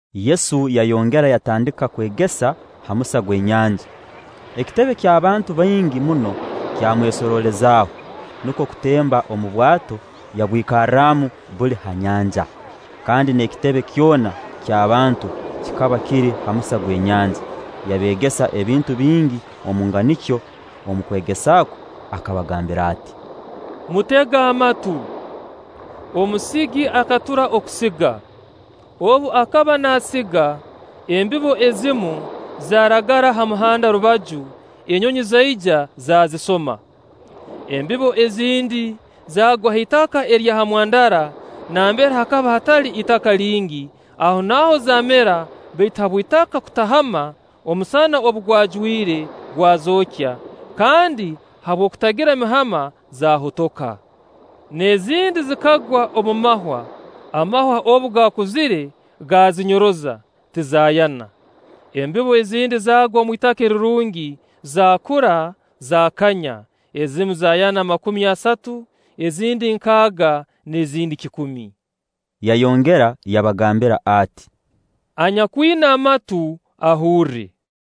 Yesu yayongera yatandika kwegesa ha musa gw'enyanja. Ekitebe ky'abantu baingi muno kyamwesorolezaaho, nukwo kutemba omu bwato yabwikarramu buli ha nyanja, kandi n'ekitebe kyona ky'abantu kikaba kiri ha musa gw'enyanja. Yabeegesa ebintu bingi omu nganikyo; omu kwegesa kwe akabagambira ati: “Mutege amatu! Omusigi akatura okusiga. Obu akaba naasiga, embibo ezimu zaaragara ha muhanda rubaju, enyonyi zaija, zaazisoma. Embibo ezindi zaagwa ha itaka erya ha mwandara nambere hakaba hatali itaka lingi, ahonaaho zaamera; baitu habw'itaka kutahama, omusana obu gwajwire gwazookya, kandi habw'okutagira mihama zaahotoka. N'ezindi zikagwa omu mahwa, amahwa obu gaakuzire, gaazinyoroza, tizaayana. Embibo ezindi zaagwa omu itaka erirungi, zaakura, zaakanya, ezimu zaayana makumi asatu, ezindi nkaaga, n'ezindi kikumi.” Yayongera yabagambira ati: “Anyakwina amatu, ahurre.”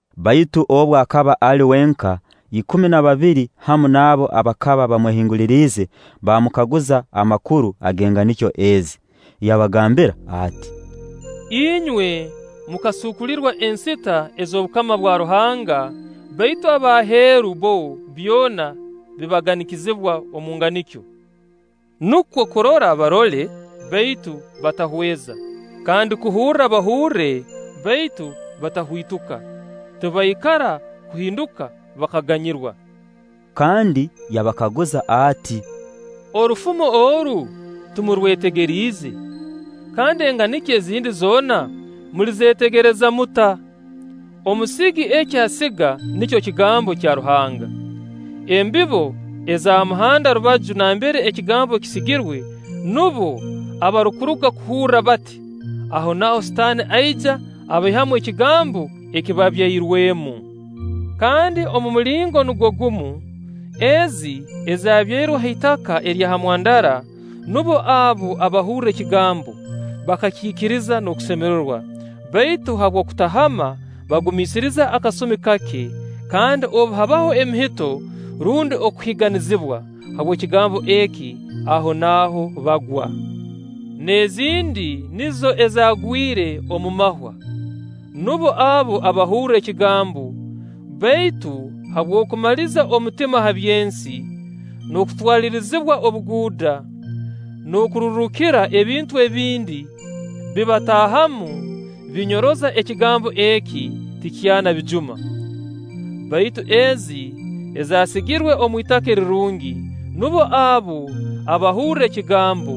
Baitu obu akaba ali wenka, ikumi na babiri hamu n'abo abakaba bamwehinguliriize baamukaguza amakuru ag'enganikyo ezi. Yabagambira ati: “Inywe mukasuukulirwa ensita ez'obukama bwa Ruhanga, baitu ab'aheeru, bbo byona bibaganikizibwa omu nganikyo; nukwo kurora barora, baitu batahweza; kandi kuhurra bahurra, baitu batahwituka; tibaikara kuhinduka bakaganyirwa.” Kandi yabakaguza ati: “Orufumo oru timurwetegeriize? Kandi enganikyo ezindi zoona mulizeetegereza muta? Omusigi eki asiga nikyo kigambo kya Ruhanga. Embibo eza ha muhanda rubaju nambere ekigambo kisigirwe, nubo abarukuruga kuhurra bati, ahonaaho Sitaani aija abaihamu ekigambo ekibabairwenu. Kandi omu mulingo nugwo gumu, ezi ezabyairwe ha itaka erya ha mwandara, nubo abo abahurra ekigambo, bakakiikiriza n'okusemerewa; baitu habw'okutahama, bagumiisiriza akasumi kake, kandi obu habaho emihito rundi okuhiiganizibwa habw'ekigambo eki, ahonaaho bagwa. N'ezindi nizo ezaagwire omu mahwa; nubo abo abahurra ekigambo, baitu habw'okumaliza omutima ha by'ensi, n'okutwalirizibwa obuguuda, n'okururuukira ebintu ebindi, bibataahamu, binyoroza ekigambo eki, tikyaana bijuma. Baitu ezi ezaasigirwe omu itaka erirungi, nubo abo abahurra ekigambo,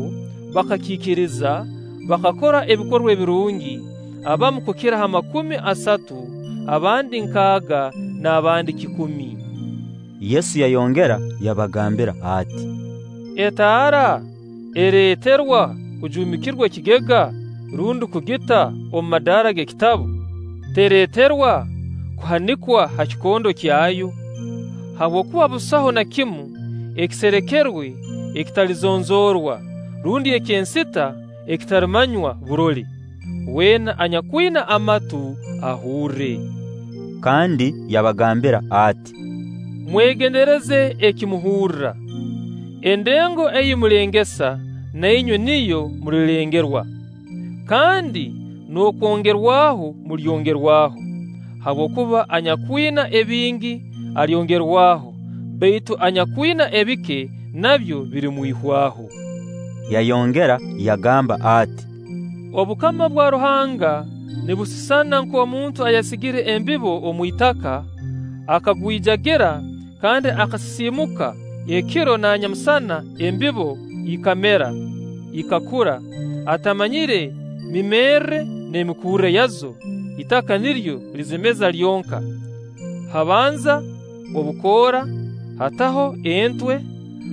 bakakiikiriza, bakakora ebikorwa ebirungi, abamu kukira ha makumi asatu, abandi nkaaga, n'abandi kikumi.” Yesu yayongera yabagambira ati: “Etaara ereeterwa kujuumikirwa ekigega rundi kugita omu madaara g'ekitabu? Tereeterwa kuhanikwa ha kikondo kyayo? Habwokuba busaho na kimu ekiserekerwe ekitalizonzoorwa; rundi eky'ensita ekitalimanywa burole. Weena anyakwina amatu, ahurre.” Kandi yabagambira ati: “Mwegendereze eki muhurra, endengo ei mulengesa, na inywe niyo mulirengerwa, kandi n'okwongerwaho mulyongerwaho. Habwokuba anyakwina ebingi, alyongerwaho; baitu anyakwina ebike, nabyo birimwihwaho.” Yayongera yagamba ati: “Obukama bwa Ruhanga nibusisana nk'omuntu ayasigire embibo omu itaka, akagwijagira kandi akasisiimuka, ekiro na nyamusana embibo ikamera, ikakura, atamanyire mimerre n'emikurre yazo Itaka niryo lizimeza lyonka; habanza obukoora, hataho entwe,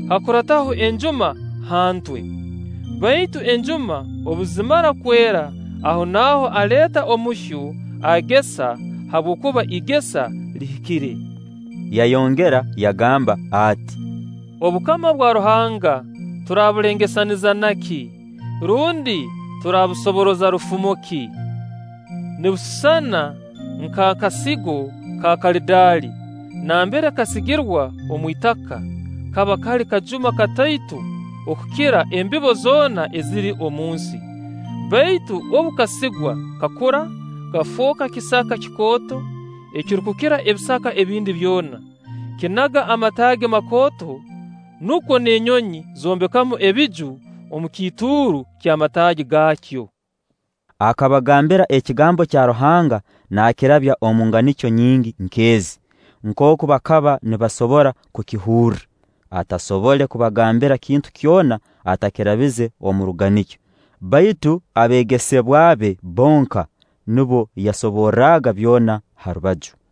hakurataho enjuma ha ntwe. Baitu enjuma obu zimara kwera, ahonaaho aleeta omuhyo, agesa, habwokuba igesa lihikire.” Yayongera yagamba ati: “Obukama bwa Ruhanga turabulengesaniza na ki? Rundi turabusoboroza rufumo ki? Nibusisana nk'akasigo ka karadaali; nambere kasigirwa omu itaka, kaba kali kajuma katoito okukira embibo zoona eziri omu nsi; baitu obu kasigwa, kakura, kafooka kisaka kikooto ekirukukira ebisaka ebindi byona, kinaga amataagi makooto, nukwo n'enyonyi zoombeka ebiju omu kiituuru ky'amataagi gaakyo.” Akabagambira ekigambo kya Ruhanga naakirabya omu nganikyo nyingi nk'ezi, nkooku bakaba nibasobora kukihurra; atasobole kubagambira kintu kyona atakirabize omu ruganikyo; baitu abeegesebwa be bonka, nubo yasoborraga byona ha rubaju.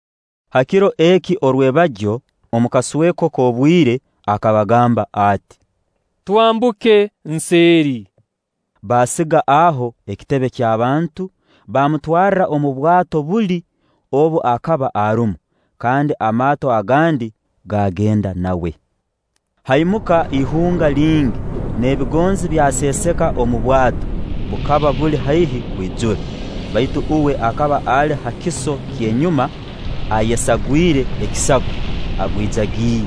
Ha kiro eki orwebagyo, omu kasweko k'obwire, akabagamba ati: “Twambuke nseeri.” Baasiga aho ekitebe ky'abantu, baamutwarra omu bwato buli, obu akaba arumu; kandi amaato agandi gaagenda nawe. Haimuka ihunga lingi n'ebigonzi byaseeseka omu bwato, bukaba buli haihi kwijura. Baitu uwe akaba ali ha kiso ky'enyuma, ayesagwire ekisago, agwijagire.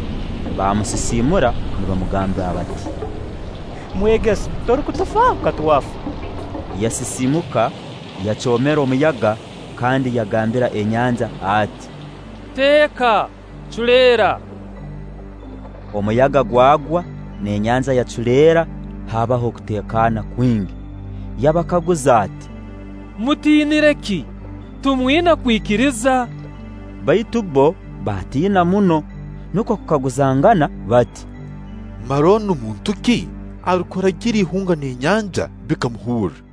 Baamusisiimura, nibamugambira bati: “Mwegesa, torukutufaaho? Ka twafa!” Yasisiimuka, yacoomera omuyaga, kandi yagambira enyanja ati: “Teeka! Culeera!” Omuyaga gwagwa n'enyanja yaculeera, haabaho okuteekana kwingi. Yabakaguza ati: “Mutiiniire ki? Timwina kwikiriza?” Baitu bbo baatiina muno, nukwo kukaguzangana bati: “Mara onu muntu ki arukuragira ihunga n'enyanja, bikamuhurra?”